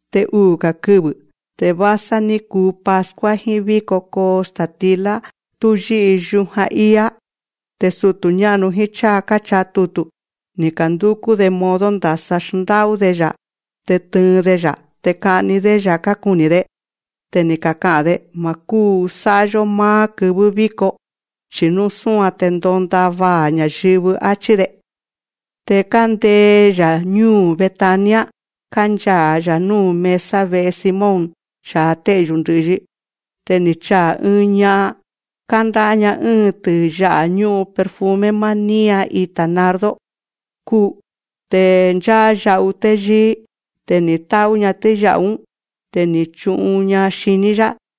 Te uu̱‑ga̱ kɨvɨ̱ te vásá ní kuu Pascua jíín víko kóo sta̱tilá tú yí'i yujan íá. Te sutu̱ ñá'nu jíín cháa káchaa tutu̱, ni̱ ka̱ndúkú‑de modo ndasa xndá'ú‑de‑ya̱ te tɨɨn‑de‑ya̱. Te ka'ni‑dé‑ya̱ kákuni̱‑de. Te ni̱ kaka'a̱n‑de: Ma̱ kúu sá'a‑yó máá kɨvɨ́ víko, chi̱ nú súan te ndonda vaa̱ ña̱yɨvɨ, áchí‑de. Te kándee‑ya̱ ñúu̱ Betania, kánchaa̱‑ya̱ núu̱ mesa ve'e Simón cha̱a té'yu̱ ndɨ̱'yi. Te ni̱ chaa̱ ɨɨn ña'an, kándá'á‑ña ɨ́ɨn tiya'a̱ ñú'un perfume máá nían ita̱ nardo kúu. Te ncháá ya'u téyíí. Te ni̱ tá'ú‑ña tíya'a̱‑ún. Te ni̱ chu'un‑ña xiní‑yá.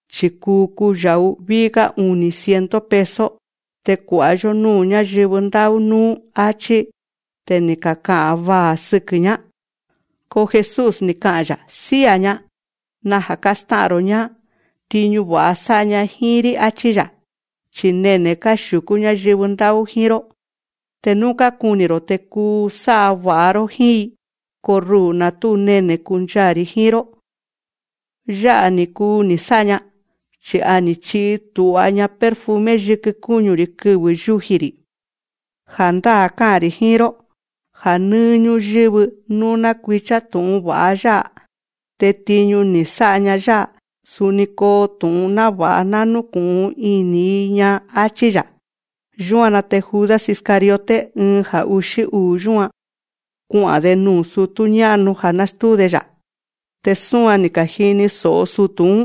Chi̱ kuu kuya̱'u ví'í‑gá uni̱ ciento peso, te kua̱'a‑yó núu̱ ñáyɨvɨ ndá'ú núú, áchí. Te ni̱ kaka'a̱n vaa̱ sɨkɨ̱‑ñá. Ko Jesús, ni̱ ka'a̱n‑ya̱: Sía̱‑ña. Naja̱ kástá'a̱n‑ro̱‑ñá. Tiñu va̱'a sá'a‑ña jíín‑rí, áchí‑ya̱. Chi̱ nene̱ káxiu̱kú ñáyɨvɨ ndá'ú jíín‑ró. Te nú kákuni̱‑ro̱ te kuu sá'a va̱'a‑ró jíín‑i. Ko ruu̱, na̱ tú nene̱ kánchaa̱‑ri̱ jíín‑ró. Ya̱'á‑ni ni̱ kuu ni̱ sá'a‑ña. Chi̱ a ni̱ chi'i tu̱'a‑ña perfume yikɨ kúñu‑ri̱ kɨvɨ̱ yúji‑ri̱. Ja̱ndáa̱ ká'a̱n‑ri̱ jíín‑ró, ja̱ nɨ́ɨ́ ñúyɨ́vɨ nú ná kui̱cha tu̱'un va̱'a yá'a, te tiñu ni̱ sá'a‑ña yá'a, suni koo tu̱'un náva̱'a ná núku̱'un ini̱‑i‑ña, áchí‑ya̱. Yúan‑na te Judas Iscariote, ɨɨn ja̱ uxí uu̱ yúan, kua'a̱n‑de nuu̱ sutú ñá'nu ja̱ nástúu‑de‑ya̱. Te súan ni̱ ka̱jini so̱'o sutu̱‑ún.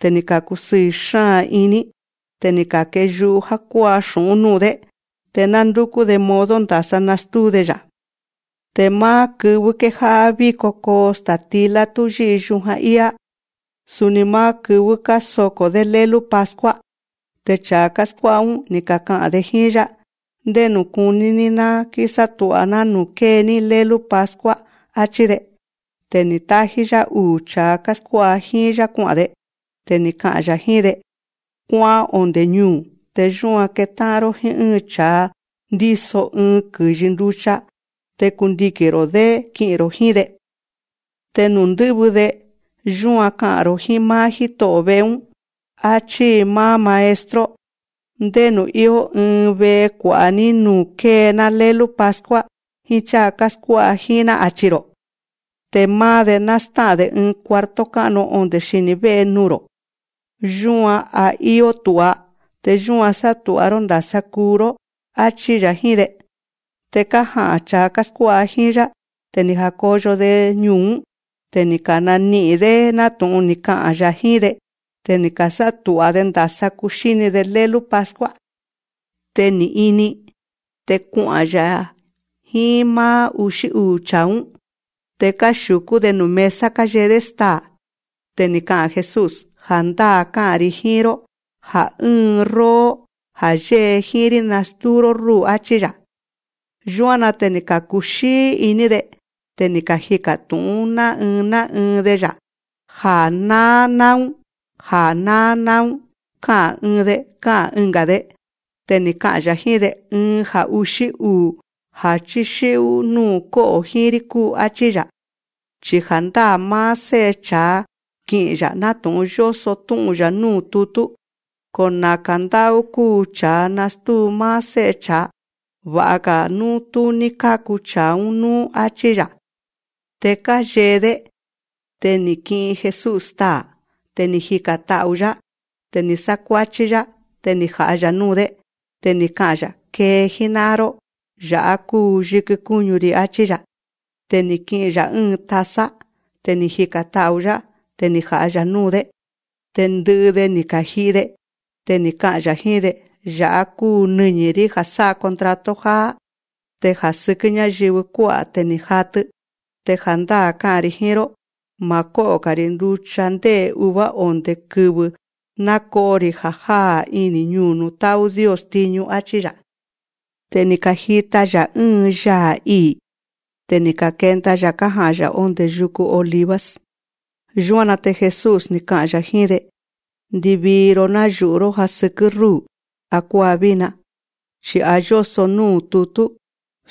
Te ni̱ ka̱kusɨɨ̱ iní. Te ni̱ ka̱keyu'u já kuá'a xu̱'ún núu̱‑dé. Te ná ndúkú‑de modo ndasa nastúu‑de‑ya̱. Te máá kɨvɨ́ kéjá'á víko kóo sta̱tilá tú yí'i yujan íá, suni máá kɨvɨ́ kásoko̱‑dé lélú Pascua, te cha̱a káskuá'a‑ún, ni̱ kaka'a̱n‑de jíín‑yá: Ndénu̱ kuní‑ní ná kísátu̱'a‑ná nuu̱ kée‑ní lélú Pascua, áchí‑de. Te ni̱ tájí‑yá uu̱ cha̱a káskuá'a jíín‑yá kua'a̱n‑de. Te ni̱ ka'a̱n‑ya̱ jíín‑de: Kuá'án onde̱ ñuu̱. Te yúan ketá'an‑ró jíín ɨ́ɨn cha̱a ndíso ɨɨn kɨ̱yi nducha. Te kundiki̱n‑ro̱‑dé ki'i̱n‑ro̱ jíín‑de. Te nuu̱ ndɨ́vɨ‑de, yúan ka'a̱n‑ro̱ jíín máá jíto'o̱ ve'e‑ún: Achí máá Maestro: Ndénu̱ íó ɨɨn ve'e kua̱'a núu‑ní nuu̱ kée‑ná lélú Pascua jíín cháa káskuá'a jíín‑ná, achi̱‑ro̱. Te máá‑de, ná stá'a̱n‑de ɨɨn cuarto ká'nu onde̱ xini̱ vé'e nuu̱‑ro̱, yúan a íó tu̱'a. Te yúan sátu̱'a‑ró ndasa kuu‑yó, áchí‑ya̱ jíín‑de. Te kája'a̱n cha̱a káskuá'a jíín‑yá. Te ni̱ ja̱koyo‑de ñuu̱‑ún. Te ni̱ kani'i̱n‑dé nátu̱'un ni̱ ka'a̱n‑ya̱ jíín‑de. Te ni̱ ka̱sátu̱'a‑de ndasa kuxíni‑de lélú Pascua. Te ni̱ ini. Te kua'a̱n‑ya̱ jíín máá uxí uu̱ cha̱a‑ún. Te káxiu̱kú‑de nuu̱ mesa káyee‑dé staa̱. Te ni̱ ka'a̱n Jesús: Ja̱ndáa̱ ká'a̱n‑ri̱ jíín‑ró, ja̱ ɨ́ɨn róó, ja̱ yée jíín‑rí, nastúu‑ró rúu̱, áchí‑ya̱. Yúan‑na te ni̱ ka̱kuxíí iní‑de. Te ni̱ kajika̱ tu̱'ún ná ɨɨn ná ɨɨn‑de‑ya̱: Ja̱ náá náún, ja̱ náá náún, ká'a̱n ɨɨn‑de, ká'a̱n ɨnga̱‑de. Te ni̱ ka'a̱n‑ya̱ jíín‑de: Ɨɨn ja̱ uxí uu̱ ja̱ chíxí'ú núu̱ kó'o̱ jíín‑rí kúu, áchí‑ya̱. Chi ja̱ndáa̱ máá Sé'e cha̱a ki'i̱n‑ya̱ nátu̱'un yóso tú'un‑ya̱ núu̱ tutú. Ko naka̱ ndá'ú kúu cha̱a nastúu máá Sé'e cha̱a. Va̱'a‑ga̱ nú tú ní káku cha̱a‑ún núú, áchí‑ya̱. Te káyee‑dé. Te ni̱ ki'in Jesús staa̱. Te ni̱ jika̱n ta'u̱‑yá. Te ni̱ sákuáchí‑yá. Te ni̱ ja̱'a‑ya̱ núu̱‑dé. Te ni̱ ka'a̱n‑ya̱: Kee jíná'an‑ró. Ya̱'á kúu yikɨ kúñu‑ri̱, áchí‑ya̱. Te ni̱ ki'in‑ya̱ ɨ́ɨn taza. Te ni̱ jika̱n ta'u̱‑yá. Te ni̱ ja̱'a‑ya̱ núu̱‑dé. Te ndɨ'ɨ‑de, ni̱ ka̱ji'i‑de. Te ni̱ ka'a̱n‑ya̱ jíín‑de: Ya̱'á kúu nɨñi̱‑rí ja̱ sá'a contrato jáá. Te ja̱ sɨkɨ́ ñáyɨvɨ kuá'a̱ te ni̱ jatɨ. Te ja̱ndáa̱ ká'a̱n‑ri̱ jíín‑ró: Ma̱ kó'o‑ga̱‑ri̱ nducha ndé'e̱ uva, onde̱ kɨvɨ̱ náko'o‑ri̱ ja̱ jáá iní ñuu̱ nuu̱ tá'ú Dios tiñu, áchí‑ya̱. Te ni̱ ka̱jita‑ya̱ ɨ́ɨn yaa̱ ii̱. Te ni̱ kenda‑ya̱ kája'a̱n‑ya̱ ondé yuku Olivos. Yúan‑na te Jesús, ni̱ ka'a̱n‑ya̱ jíín‑de: Ndivii‑ro, nayu̱'ú‑ro̱ já sɨkɨ́ rúu̱ akuáa vína. Chi̱ a yóso núu̱ tutú: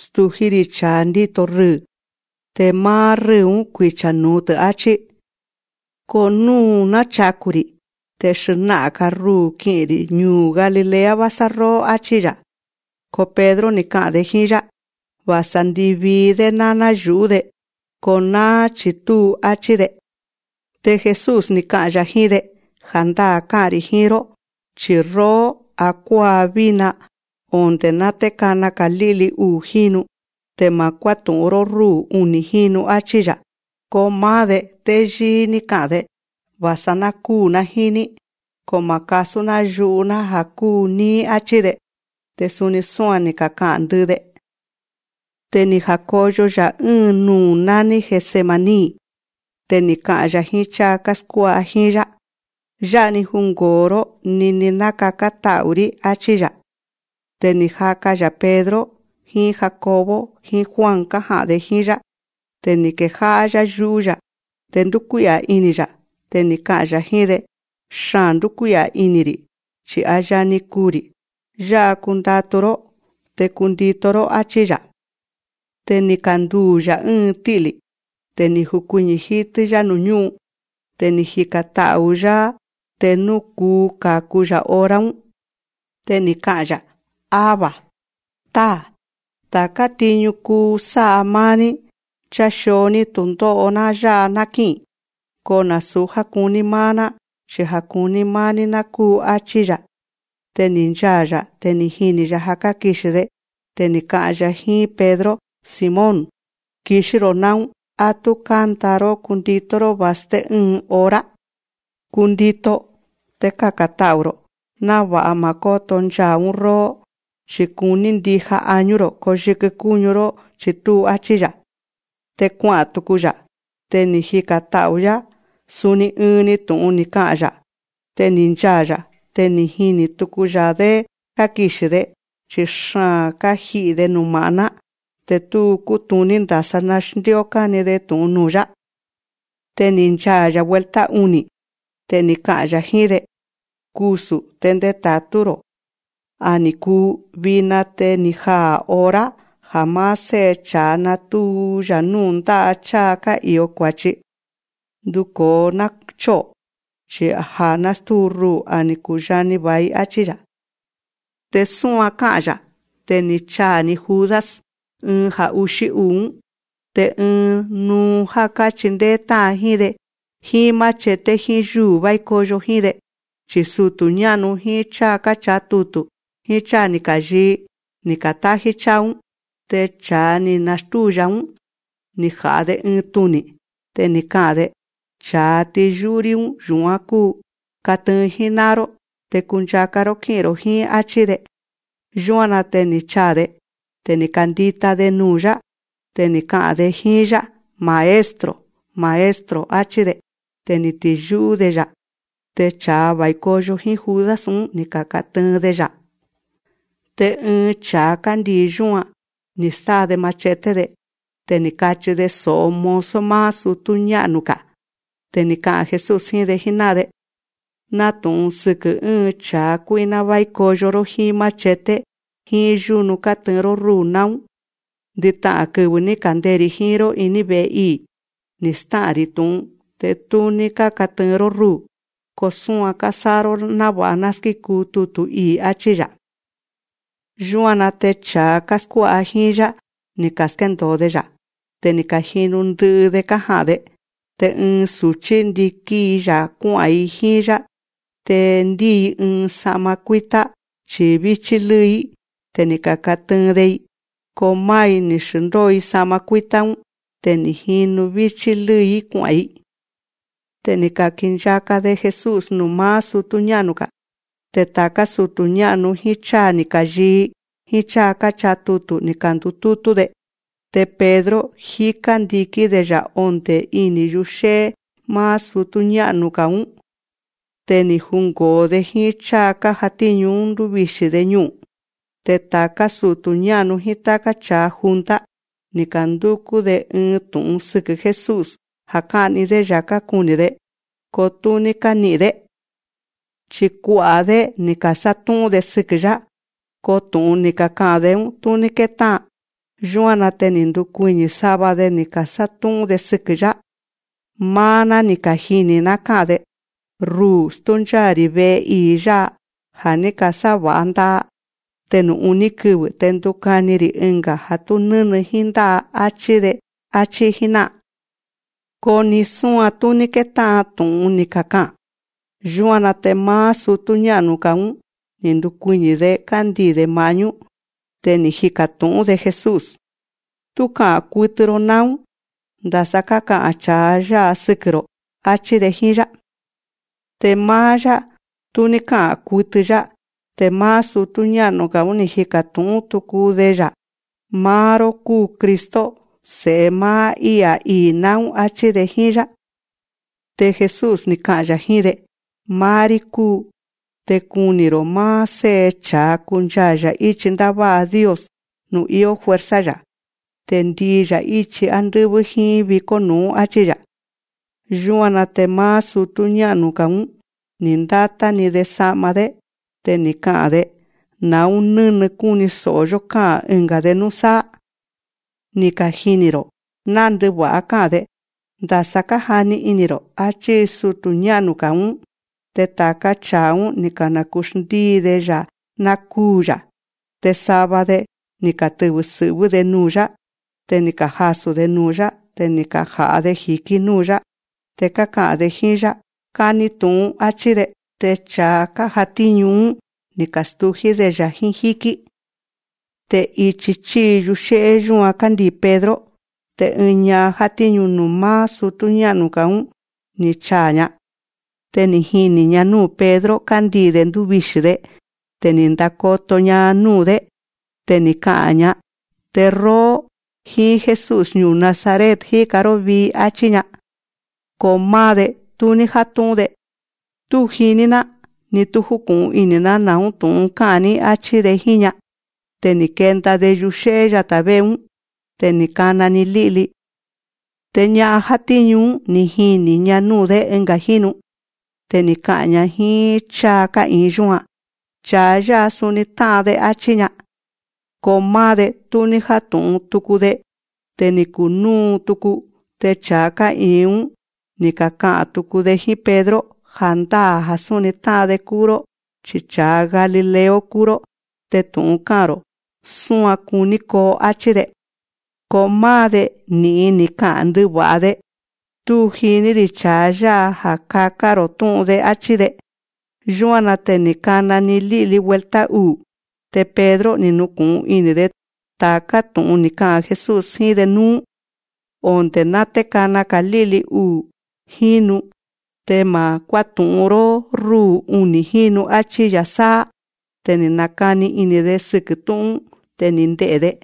Stují‑rí cha̱a ndíto rɨɨ̱, te máá rɨ́ɨ̱‑ún, kuicha̱‑tɨ̱, áchí. Ko nuu̱ náchaku̱‑ri̱, te xna'a̱n‑ga̱ ruu̱ ki'i̱n‑ri̱ ñuu̱ Galilea vásá róó, áchí‑ya̱. Ko Pedro, ni̱ ka'a̱n‑de jíín‑yá: Va̱sa ndivii‑dé ná náyu̱'ú‑de, ko náá chi̱ túu, áchí‑de. Te Jesús, ni̱ ka'a̱n‑ya̱ jíín‑de: Ja̱ndáa̱ ká'a̱n‑ri̱ jíín‑ró, chi̱ róó, akuáa vína, onde̱ ná té kana‑ga̱ lí'li uu̱ jínu, te ma̱ kuátu̱'un‑ró rúu̱ uni̱ jínu, áchí‑ya̱. Ko máá‑de, téyíí ní ka'a̱n‑de: Va̱sa ná kúu̱‑ná jíín‑ní, ko ma̱ kasú‑ná yu'u‑ná ja̱ kúu níí, áchí‑de. Te suni súan ni̱ kaka'a̱n ndɨ'ɨ‑de. Te ni̱ ja̱koyo‑ya̱ ɨ́ɨn nuu̱ nání Getsemaní. Te ni̱ ka'a̱n‑ya̱ jíín cháa káskuá'a jíín‑yá: Yá'a‑ni jungo̱o‑ró nini ná kakán ta'u̱‑rí, áchí‑ya̱. Te ni̱ jaka‑ya̱ Pedro jíín Jacobo jíín Juan kája'a̱n‑de jíín‑yá. Te ni̱ kejá'á‑yá yú'ú‑ya̱, te ndúkuí'a̱ ini̱‑ya̱. Te ni̱ ka'a̱n‑ya̱ jíín‑de: Xaa̱n ndúkuí'a̱ ini̱‑ri̱, chi̱ a yani kuu̱‑ri̱. Yá'a kundatu‑ró, te kundito‑ró, áchí‑ya̱. Te ni̱ kanduu̱‑ya̱ ɨ́ɨn tí'lí. Te ni̱ jukuiñi̱ jítɨ́‑yá nuu̱ ñú'un. Te ni̱ jika̱n ta'u̱‑yá, te nú kuu ka̱ku‑ya̱ hora‑ún. Te ni̱ ka'a̱n‑ya̱: Abba, Táa̱. Ta̱ká tiñu kúu sá'a máá‑ní. Chaxio‑ní tu̱ndó'o‑ná yá'a ná kí'i̱n. Ko nasu̱ já kuní máá‑ná, chi ja̱ kuní máá‑ní ná kúu, áchí‑ya̱. Te ni̱ nchaa̱‑ya̱. Te ni̱ jini̱‑ya̱ já kákixi̱‑de. Te ni̱ ka'a̱n‑ya̱ jíín Pedro: Simón, kixí‑ro̱ náún. Á tú kánda‑ró kúndito‑ró va̱sté ɨ́ɨn hora. Kundito, te kaka̱n ta'u̱‑ro̱, náva̱'a ma̱ kóto nchaa̱‑ún róó. Chi̱ kuní ndija añú‑ro̱, ko yikɨ kúñu‑ró chi̱ túu, áchí‑ya̱. Te kua'a̱n tuku‑ya̱. Te ni̱ jika̱n ta'u̱‑yá. Suni ɨɨn‑ni tu̱'un ni̱ ka'a̱n‑ya̱. Te ni̱ nchaa̱‑ya̱. Te ni̱ jini̱ tuku‑ya̱‑dé kákixi̱‑de, chi̱ xaa̱n káji'i̱‑de numa̱'ná. Te tú kútuní ndasa xndíó káni‑de tu̱'un nuu̱‑yá. Te ni̱ nchaa̱‑ya̱ vuelta uni̱. Te ni̱ ka'a̱n‑ya̱ jíín‑de: Kusu̱ te ndeta̱tú‑ro̱‑ná. A ni̱ kuu. Vina te ni̱ jaa̱ hora ja̱ máá Sé'e cha̱a natu̱u‑ya̱ núu̱ ndá'a cháa ká'i̱o kua̱chi. Nduko̱o, ná chó'o̱. Chi ja̱ nástúu ruu̱, a ni̱ kuyani va̱i, áchí‑ya̱. Te súan ká'a̱n‑ya̱, te ni̱ chaa̱‑ni Judas, ɨɨn ja̱ uxí uu̱‑ún. Te ɨɨn nuu já káchindéé tá'an jíín‑de, jíín machete jíín yúnu vái koyo jíín‑de. Chi̱ sutu̱ ñá'nu jíín cháa káchaa tutu̱ jíín cháa ni̱ ka̱yii, ni̱ ka̱tájí cháa‑ún. Te cha̱a ni̱ nastúu‑ya̱‑ún, ni̱ ja̱'a‑de ɨɨn tuni̱, te ni̱ ka'a̱n‑de: Cha̱a tíyú'ú‑rí‑ún, yu̱án kúu. Katɨɨn jíná'an‑ró, te kunchaka‑ró kí'i̱n‑ro̱ jíín, áchí‑de. Yúan‑na te ni̱ chaa̱‑de. Te ni̱ kandita‑ni‑de nuu̱‑yá. Te ni̱ ka'a̱n‑de jíín‑yá: Maestro, Maestro, áchí‑de. Te ni̱ tiyú'ú‑de‑ya̱. Te cha̱a va̱i koyo jíín Judas‑ún, ni̱ ka̱katɨɨn‑de‑ya̱. Te ɨɨn cha̱a kándii̱ yúan, ni̱ stáa‑de machete‑de. Te ni̱ kachi‑de so̱'o mozo máá sutú ñá'nu‑ga̱. Te ni̱ ka'a̱n Jesús jíín‑de jíná'an‑de: Nátu̱'un sɨkɨ̱ ɨ́ɨn cha̱a kuí'ná vái koyo‑ró jíín machete jíín yúnu kátɨɨn‑ró rúu̱ náún. Ndɨta'a̱n kɨvɨ̱ ní ka̱ndee‑ri̱ jíín‑ró iní ve̱'e ii̱, ni̱ stá'a̱n‑ri̱ tu̱'un, te tú ní kákatɨɨn‑ró rúu̱. Ko súan kásá'a‑ró náva̱'a ná skíkuu tutu̱ ii̱, áchí‑ya̱. Yúan‑na te cha̱a káskuá'a jíín‑yá, ni̱ ka̱skéndo̱o‑de‑ya̱. Te ni̱ ka̱jinu ndɨ'ɨ‑de kája'a̱n‑de. Te ɨɨn su̱chí, ndikín‑i‑ya̱ kuá'a̱n‑i jíín‑yá. Te ndíi‑i ɨɨn sa'ma kuítá, chi̱ víchí lɨ́ɨ‑í. Te ni̱ ka̱katɨɨn‑de‑i. Ko máá‑i, ni̱ xndóo‑i sa'ma kuítá‑ún. Te ni̱ jinu víchí lɨ́ɨ‑í kua'a̱n‑i. Te ni̱ ka̱kinchaka‑de Jesús nuu̱ máá sutú ñá'nu‑ga̱. Te ta̱ká sutu̱ ñá'nu jíín cháa ni̱ ka̱yii jíín cháa káchaa tutu̱, ni̱ ka̱ndutútú‑de. Te Pedro, jíká ndikín‑de‑ya̱ ondé ini̱ yuxé'é máá sutú ñá'nu‑ga̱‑ún. Te ni̱ jungo̱o‑de jíín cháa kájatíñu‑ún, ndúvixi̱‑de ñu'u̱n. Te ta̱ká sutu̱ ñá'nu jíín táká cha̱a junta, ni̱ ka̱ndúkú‑de ɨɨn tu̱'un sɨkɨ̱ Jesús, ja̱ ká'ni‑dé‑ya̱ kákuni̱‑de. Ko tú ní káni'i̱n‑dé. Chi̱ kua'a̱‑dé, ni̱ ka̱sátú'ún‑de sɨkɨ̱‑yá. Ko tu̱'un ni̱ kaka'a̱n‑de‑ún, tú ní kétá'an. Yúan‑na te ni̱ ka̱ndukuiñi̱ sava‑de, ni̱ ka̱sátú'ún‑de sɨkɨ̱‑yá: Máá‑ná, ni̱ kajini̱‑ná ká'a̱n‑de: Ruu̱, stúncháa̱‑ri̱ ve'e ii̱ yá'a ja̱ ní ka̱sáva̱'a nda'a. Te nuu̱ uní kɨvɨ̱ te ndukani‑ri̱ ɨnga̱ ja̱ tú nɨ́nɨ jíín ndá'a, áchí‑de, áchí jíná'an. Ko ni súan tú ní kétá'an tu̱'un ni̱ kaka'a̱n. Yúan‑na te máá sutú ñá'nu‑ga‑ún, ni̱ ndukuiñi̱‑de kándii̱‑de ma̱'ñú. Te ni̱ jika̱ tu̱'ún‑de Jesús: Tú ka'a̱n kutɨ‑ro náún. Ndasa káka'a̱n cha̱a yá'a sɨkɨ̱‑ro̱, áchí‑de jíín‑yá. Te máá‑yá, tú ní ká'a̱n kutɨ‑yá. Te máá sutú ñá'nu‑ga̱‑ún, ni̱ jika̱ tu̱'ún tuku de‑ya̱: Máá‑ró kúu Cristo, Se̱'e máá I'a̱ ii̱ náún, áchí‑de jíín‑yá. Te Jesús, ni̱ ka'a̱n‑ya̱ jíín‑de: Máá‑rí kúu. Te kuni̱‑ro̱ máá Sé'e cha̱a kunchaa̱‑ya̱ íchi ndává'a Dios nuu̱ íó fuerza‑ya̱. Te ndii‑ya̱ íchi ándɨ́vɨ́ jíín vikó nu̱'ún, áchí‑ya̱. Yúan‑na te máá sutú ñá'nu‑ga̱‑ún, ni̱ ndátá‑ni‑de sa'ma‑dé. Te ni̱ ka'a̱n‑de: Na̱ún nɨ́nɨ kúni so̱'o‑yó ká'a̱n ɨnga̱‑de núsáá. Ni̱ kajini̱‑ro̱ ná ndɨva̱'a ká'a̱n‑de. Ndasa kájani ini̱‑ro̱. Achí sutu̱ ñá'nu‑ga̱‑ún. Te ta̱ká cha̱a‑ún, ni̱ ka̱naku̱xndíi‑de‑ya̱ ná kúu̱‑ya̱. Te sava‑de, ni̱ katɨvɨ̱ sɨ̱'vɨ́‑de nuu̱‑yá. Te ni̱ kajasu̱‑de nuu̱‑yá. Te ni̱ kaja̱'a‑de ji̱kí núu̱‑yá. Te káka'a̱n‑de jíín‑yá: Kani tu̱'un, áchí‑de. Te cha̱a kájatíñu‑ún, ni̱ ka̱stují‑dé‑ya̱ jíín jíkí. Te ichi chíi yuxé'é yúan kándii̱ Pedro. Te ɨɨn ña'an játíñu nuu̱ máá sutú ñá'nu‑ga̱‑ún, ni̱ chaa̱‑ña. Te ni̱ jini̱‑ña núu̱ Pedro kándii̱‑de ndúvixi̱‑de. Te ni̱ ndakoto‑ña núu̱‑dé. Te ni̱ ka'a̱n‑ña: Te róó, jíín Jesús ñuu̱ Nazaret jíka‑ró vii, áchí‑ña. Ko máá‑de, tú ní játu̱'un‑de. Tú jiní‑ná, ni tú júku̱'un ini̱‑ná na̱ún ká'a̱n‑ní, áchí‑de jíín‑ña. Te ni̱ kenda‑de yuxé'é yatá vé'e‑ún. Te ni̱ kana‑ni lí'li. Te ña'an játíñu‑ún, ni̱ jini̱‑ña núu̱‑dé ɨnga̱ jínu. Te ni̱ ka'a̱n‑ña jíín cháa ká'i̱in yúan. Cha̱a yá'a suni tá'an‑de, áchí‑ña. Ko máá‑de, tú ní játu̱'un tuku‑de. Te ni̱ kunúu tuku. Te cha̱a ká'i̱in‑ún, ni̱ kaka'a̱n tuku‑de jíín Pedro: Ja̱ndáa̱ ja̱ súni tá'an‑de kúu‑ró, chi cha̱a galileo kúu‑ró. Te tu̱'un ká'a̱n‑ro̱ súan kuní koo, áchí‑de. Ko máá‑de, ni̱'in ni̱ ka'a̱n ndɨva̱'a‑de: Tú jiní‑ri̱ cha̱a yá'a ja̱ káka'a̱n‑ro̱ tú'un‑de, áchí‑de. Yúan‑na te ni̱ kana‑ni lí'li vuelta uu̱. Te Pedro, ni̱ nuku̱'un ini̱‑de ta̱ká tu̱'un ni̱ ka'a̱n Jesús jíín‑de núú: Onde̱ ná té kana‑ga̱ lí'li uu̱ jínu, te ma̱ kuátu̱'un‑ró rúu̱ uni̱ jínu, áchí‑ya̱ sáá. Te ni̱ nakani ini̱‑de sɨkɨ̱ tú'un‑ún. Te ni̱ nde'e̱‑de.